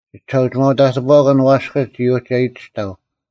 ᒋᒋᓴᐅᒋᒪᐅ-ᑕᑎᐳᐛᑭᓐ ᐛᔅᑭᒡ ᒋ ᐅᒋ ᐊᔨᑎᔅᑕᐤ: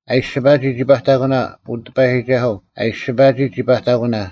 ᐊ ᐃᔅᒋᐸᒋ ᒋ ᐸᑕᑯᓇ, ᐅ ᑎᐸᔨᒋᒐᓱᐤ, ᐊ ᐃᔅᒋᐸᒋ ᒋ ᐸᑕᑯᓇ: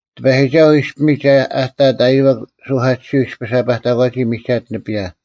ᑎᐸᔨᒋᒐᓱᐤ ᐃᔅᐱᒥᒡ ᐊ ᑕᑦ ᐃᔨᐛᒄ ᓱᐧᑲᑎᓯᐤ ᐃᔅᐱᔅ ᐊ ᐸᑕᒂᒋ ᒥᒐᑦ ᓂᐱᔭ,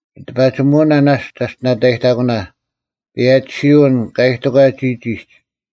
ᒋᑎᐸᒋᒧᐅᓇ ᓇᔅᒡ ᒐᔅᑎᓇᑕᔨᑕᑯᓇ: ᐸᔭᒋᓯᐅᓐ ᑲ ᐃᑎᒂᒡ ᒋᒋᒡ,